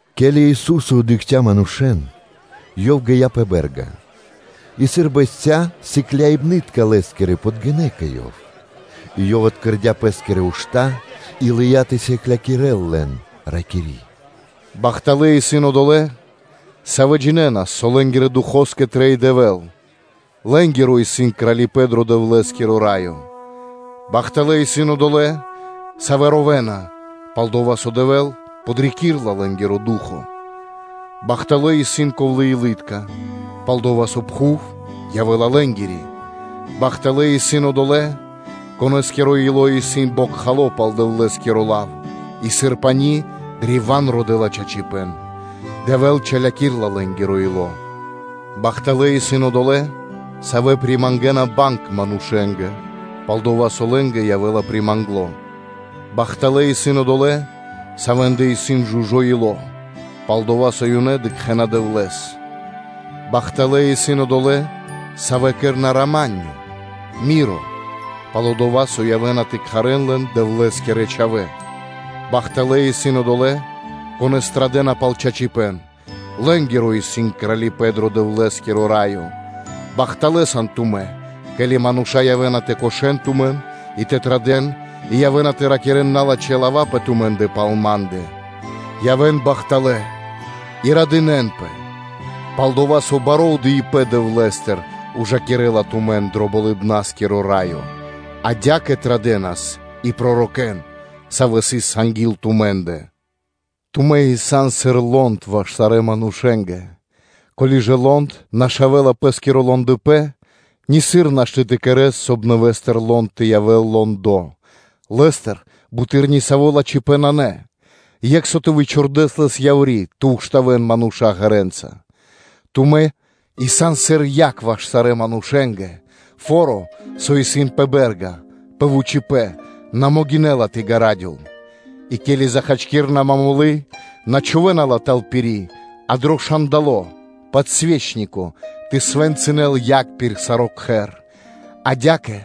Ке́ли Ису́со дыкхця́ манушэ́н, Ёв гия́ пэ бэ́рга, и, сыр бэсця́, сыкляибны́тка (учэники) Лэ́скирэ подгинэ́ кэ Ёв, и Ёв откэрдя Пэ́скирэ ушта́ и лыя́ тэ сыклякирэ́л лэн, ракири́: “Бахталэ́ исын одолэ́, савэ́ джинэ́на, со лэ́нгирэ духоскэ трэй Дэвэ́л; лэ́нгиро сыс Кралипэ́н дро Дэвлэ́скиро Раё. Бахталэ́ исын одолэ́, савэ́ ровэна, пал-дова́ со Дэвэ́л подрикирэ́ла лэ́нгиро ду́хо (фа́но). Бахталэ́ исын ковлэ́-илы́тка, пал-дова́ со пхув явэ́ла лэ́нгири. Бахталэ́ исын одолэ́, конэ́скиро ило́ исын бокхало пал Дэвлэ́скиро лав и сыр пани́ древа́н родэ́ла чачипэ́н. Дэвэ́л чалякирэла лэ́нгиро ило́. Бахталэ́ исын одолэ́, савэ́ примангэна банг манушэ́нгэ, пал-дова́ со лэ́нгэ явэ́ла примангло. Бахталэ́ исын одолэ́, савэ́ндэ исын жужо́ (чы́сто) ило́, пал-дова́ со ёнэ дыкхэ́на Дэвлэ́с. Бахталэ́ исын одолэ́, савэ́ кэрэ́на рама́нё (миро), пал-дова́ со явэ́на тэ кхарэ́н лэн ‘Дэвлэ́скирэ чхавэ́.’ Бахталэ́ исын одолэ́, конэ́с традэ́на пал чачипэ́н; лэ́нгиро исын Кралипэ́н дро Дэвлэ́скиро Раё. Бахталэ́ сан тумэ́, ке́ли мануша́ явэ́на тэ кошэн тумэн и тэ традэ́н, и явэ́на тэ ракирэ́н налачхэ́ лава́ пэ тумэ́ндэ пал Ма́ндэ. Явэ́н бахталэ́ и радынэ́нпэ, пал-дова́ со баро́ отдыибэ́н Дэвлэ́стыр ужакирэ́ла тумэн дро Болыбна́скиро Раё: адя́кэ традэнас и пророкэ́н, савэ́ сыс анги́л тумэ́ндэ. Тумэ́ исын сыр лонд ваш сарэ́ манушэ́нгэ. Ко́ли ж лонд нашавэла пэ́скиро лондыпэн, нисыр нашты́ тэ кэрэ́с, соб (кай) нэвэ́стыр лонд тэ явэ́л лондо; лэ́стэ буты́р ни саво́ лачхипэ́н нанэ, екх со тэ вычхурдэс лэс яври́ тэ штавэн мануша́ ґэрэ́нца. Тумэ́ исын сыр яг ваш сарэ́ манушэ́нгэ. Фо́ро, со исын пэ бэ́рга пэ вучипэ́н, на могинэ́ла тэ ґарадёл. И ке́ли захачкирэна момолы́ (све́чка), на чхувэ́на ла тэл пири́, а дро шандало (подсвечнико) тэ свэнцынэл яг пир саро́ кхэр. Адя́кэ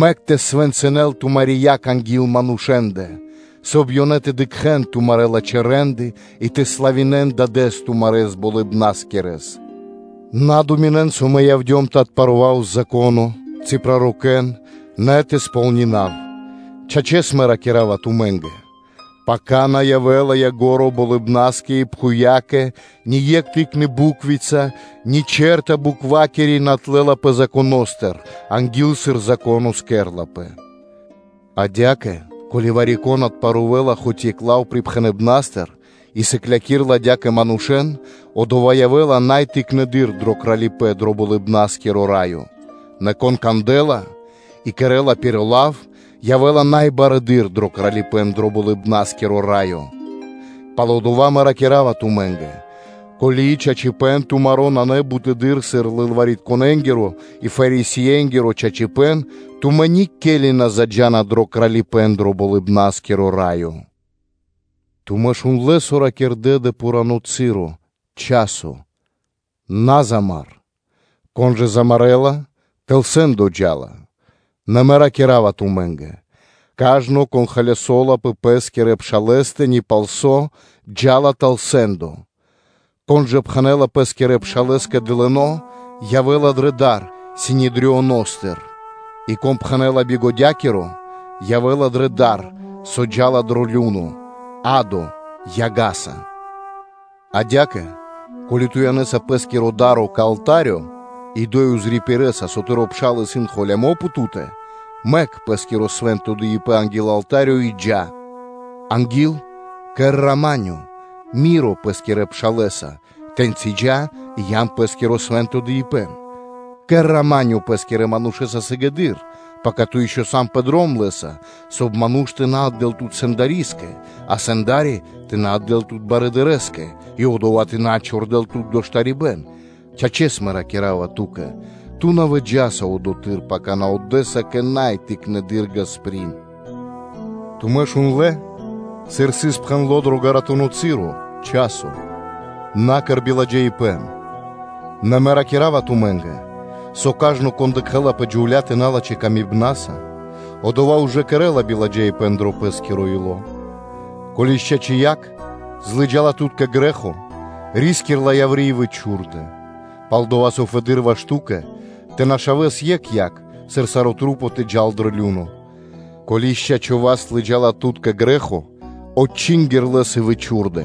мэк тэ свэнцынэл тумари́ яг анги́л манушэ́ндэ, соб (кай) ёнэ тэ дыкхэ́н тумарэ́ лачхэ́ рэ́нды и тэ славинэ́н Дадэ́с тумарэс Болыбнаскирэс. На думинэн, со Мэ явдём тэ отпарував Зако́но ци пророкэ́н, нэ тэ кэра́в кэ ко́нцо/яго́ро (тэ сполнинав). Чачэс, Мэ ракира́ва тумэ́нгэ: пака на явэ́ла ко́нцо (яго́ро) болыбнаскэ и пхувьякэ, ни екх тыкны буквица ни чэрта буквакири на отлэлапэ Законо́стыр анги́л, сыр Зако́но тэ кэрэ́лпэ. Адя́кэ, ко́ли вари-кон отпарувэла хоць екх лав припхэныбнастыр и сыклякирэ́ла адя́кэ манушэ́н, одова́ явэ́ла най тыкнэды́р дро Кралипэ́н дро Болыбна́скиро Раё. Нэ кон кандэ́ла и кэрэ́ла пир лав, явэ́ла най барэды́р дро Кралипэ́н дро Болыбна́скиро Раё. Палдова́ Мэ ракира́ва тумэ́нгэ: ко́ли чачипэ́н тумаро́ нанэ бутэды́р сыр лылваритконэнгиро (книжникэ́нгиро) и Фарисеенгиро чачипэ́н, тумэ́ никели на заджа́на дро Кралипэ́н дро Болыбна́скиро Раё. Тумэ́ шундлэ́, со ракирдэ́ дро пхурано́ часо: ‘На замар (на умар), кон жа замарэла, тэл сэ́ндо джа́ла.” Нэ Мэ ракира́ва тумэ́нгэ: ‘Кажно, кон холясо́ла пэ пэ́скирэ пшалэ́стэ ни палсо́, джа́ла тэл сэ́ндо. Кон жа пхэнэ́ла пэ́скирэ пшалэ́скэ ‘дылыно́’, явэ́ла дрэ дар Синедрионостыр. И кон пхэнэ́ла ‘бигодякиро’, явэ́ла дрэ дар, со джа́ла дро лю́но (адо) яга́са. Адя́кэ, ко́ли ту янэса пэ́скиро да́ро кэ алта́рё, и одо́й пририпирэса, со тыро́ пшал исын холямо́ пэ Ту́тэ, мэк пэ́скиро свэ́нто дыибэ́н анги́л алта́рё и джа́, анги́л кэр рама́нё (миро) пэ́скирэ пшалэса, тэ́ньчи джа́ и ян пэ́скиро свэ́нто дыибэ́н. Кэр ‘рама́нё’ (миро) пэ́скирэ манушэ́са сыгэды́р, пака ту ишчо (инкэ́) сан пэ дром лэ́са, соб (кай) ману́ш тэ на отдэ́л тут сэндарискэ, а сэнда́ри тэ на отдэ́л тут дынари́скэ (слуга́скэ), и одова́ тэ на чхурдэл тут дро штарибэ́н. Чачэс, Мэ ракира́ва ту́кэ: ту на выджаса одотхы́р, пака ту отдэса кэ най тыкнэды́р ґасприн’ Тумэ́ шундлэ́, сыр сыс пхэндло́ дро ґаратуно часо: ‘На кэр биладжаипэ́н.’ Нэ Мэ ракира́ва тумэ́нгэ, со кажно, кон дыкхэ́ла пэ джувля́тэ налачхэ́ камибнаса, одова́ ужэ кэрэ́ла биладжаипэ́н дро пэ́скиро ило́. Ко́ли ж чачи́ якх злыджала тут кэ грэ́хо, ри́скир ла яври́ и вычхурдэ; пал-дова́ со фэды́р ваш ту́кэ тэ нашавэс екх якх, сыр саро́ тэ джал дро лю́но (адо). Ко́ли ж чачо́ (пра́во) васт лыджа́ла тут кэ грэ́хо, отчингир лэс и вычхурдэ;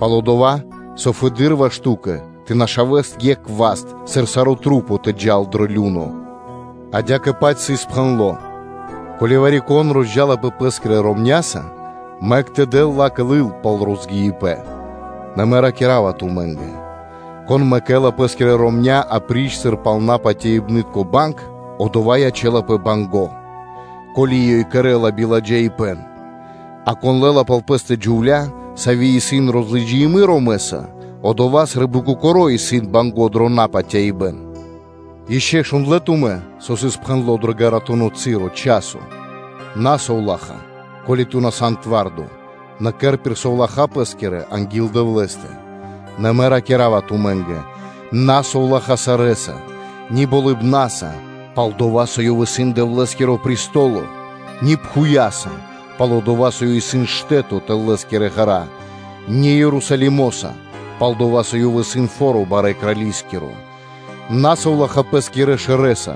пал-дова́ со фэды́р ваш ту́кэ тэ нашавэс екх васт, сыр сарэ́ маса́ тэ джа́н дро лю́но. Адя́кэ-паць сыс пхэндло́: ‘Ко́ли вари-кон розджалапэ пэ́скирэ ромня́са, мэк тэ дэл ла́кэ лыл пал розгиибэн.’ Нэ, Мэ ракира́ва тумэ́нгэ: ‘Кон мэкэ́ла пэ́скирэ ромня́ апри́ч сыр пал напатяибнытко банг, одова́ ячэ́лапэ банго́, ко́ли ёй кэрэ́ла биладжаипэ́н; а кон лэ́ла пал пэ́стэ джувля́, сави́ исын розлыджины ромэса, одова́ сы́рбы кокоро́ исын банго́ дро напатяибэн. Ишчо шундлэ́ тумэ́, со сыс пхэндло́ дро ґаратуно часо: ‘На совлаха́, ко́ли ту на сан твардо; нэ кэр пир совлаха́ пэ́скирэ анги́л Дэвлэ́стэ! Нэ Мэ ракира́ва тумэ́нгэ: ‘На совлаха́ сарэ́са; ни болыбнаса, пал-дова́ со ёв исын Дэвлэ́скиро престоло; ни пхувья́са, пал-дова́ со ёй исын штэ́то тэл Лэ́скирэ ґэра́, ни Ерусалимоса, пал-дова́ со ёв исын фо́ро барэ́ Крали́скиро; на совлаха́ пэ́скирэ шэрэ́са,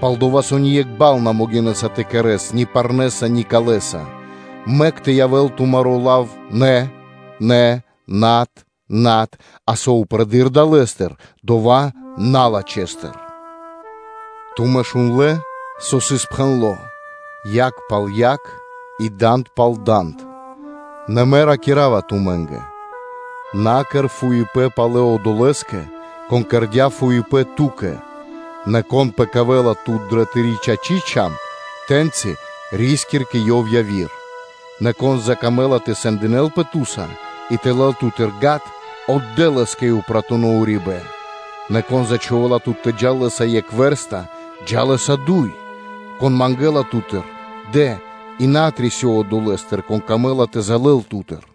пал-дова́ со ни екх бал на могинэ́са тэ кэрэ́с ни парнэса, ни калэса. Мэк тэ явэ́л тумаро́ лав ‘ны, ны’, ‘над, над’, а со упрэдыр далэ́стыр, дова́ исын налачхэстыр.’ Тумэ́ шундлэ́, со сыс пхэндло́: ‘Якх пал якх, и данд пал данд.’ Нэ Мэ ракира́ва тумэ́нгэ: на кэр фуипэ́н палэ одолэ́скэ, кон кэрдя́ фуипэ́н ту́кэ; нэ кон пэкавэла тут дрэ тыри́ чачи́ (право) чам (шчока), тэ́ньчи ри́скир кэ ёв яви́р. Нэ кон закамэ́ла тэ сэндинэлпэ ту́са и тэ лэл ту́тыр гад, отдэ́ лэ́скэ и упратуно урибэ́н. Нэ кон зачхувэла тут тэ джал лэ́са екх вэрста, джа́ лэ́са дуй. Кон мангэ́ла ту́тыр, дэ, и на отрисёв одолэ́стыр, кон камэ́ла тэ залэл ту́тыр.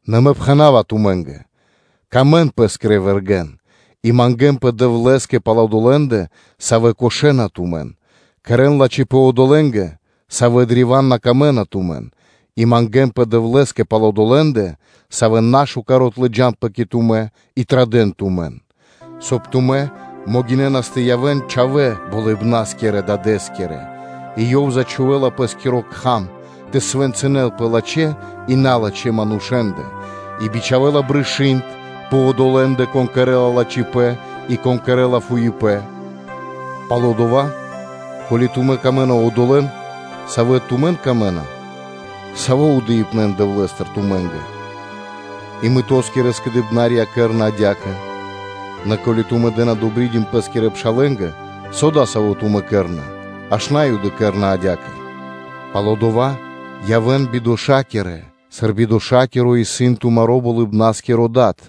Нэ Мэ пхэна́ва тумэ́нгэ: сыкавэ́н паты́в пэ́скирэ вэргэ́нгэ, и мангэ́нпэ Дэвлэ́скэ пал одолэ́ндэ, савэ́ кошэна тумэн, кэрэ́н лачхипэ́н одолэ́нгэ, савэ́ древа́н на камэ́на тумэн и мангэ́нпэ Дэвлэ́скэ пал одолэ́ндэ, савэ́ нашукар отлыджанапэ кэ тумэ́ и традэ́на тумэн; соб (кай) тумэ́ могинэ́нас тэ явэ́н ‘чхавэ́ Болыбна́скирэ Дадэ́скирэ’, и Ёв зачхувэла Пэ́скиро Кхам тэ свэнцынэл пэ лачхэ́ и налачхэ́ манушэ́ндэ, и бичхавэ́ла брышы́нд пэ одолэ́ндэ, кон кэрэ́ла лачхипэ́н и кон кэрэ́ла фуипэ́н. Палдова́, ко́ли тумэ́ сыкавэ́на паты́в одолэ́нгэ, савэ́нгэ тумэ́ сан дро́га, саво́ отдыибэ́н Дэвлэ́стыр явэ́ла тумэ́нгэ? И мытоскирэ скэдыибнарья кэрэ́на адя́кэ. Нэ ко́ли тумэ́ дэ́на ‘добридим’ пэ́скирэ пшалэ́нгэ, со дасаво тумэ́ кэрэ́на? Аж На́юды кэрэ́на адя́кэ. Палдова́ явэ́н бидошакирэ, сыр бидошакиро исын тумаро́ Болыбна́скиро Дад.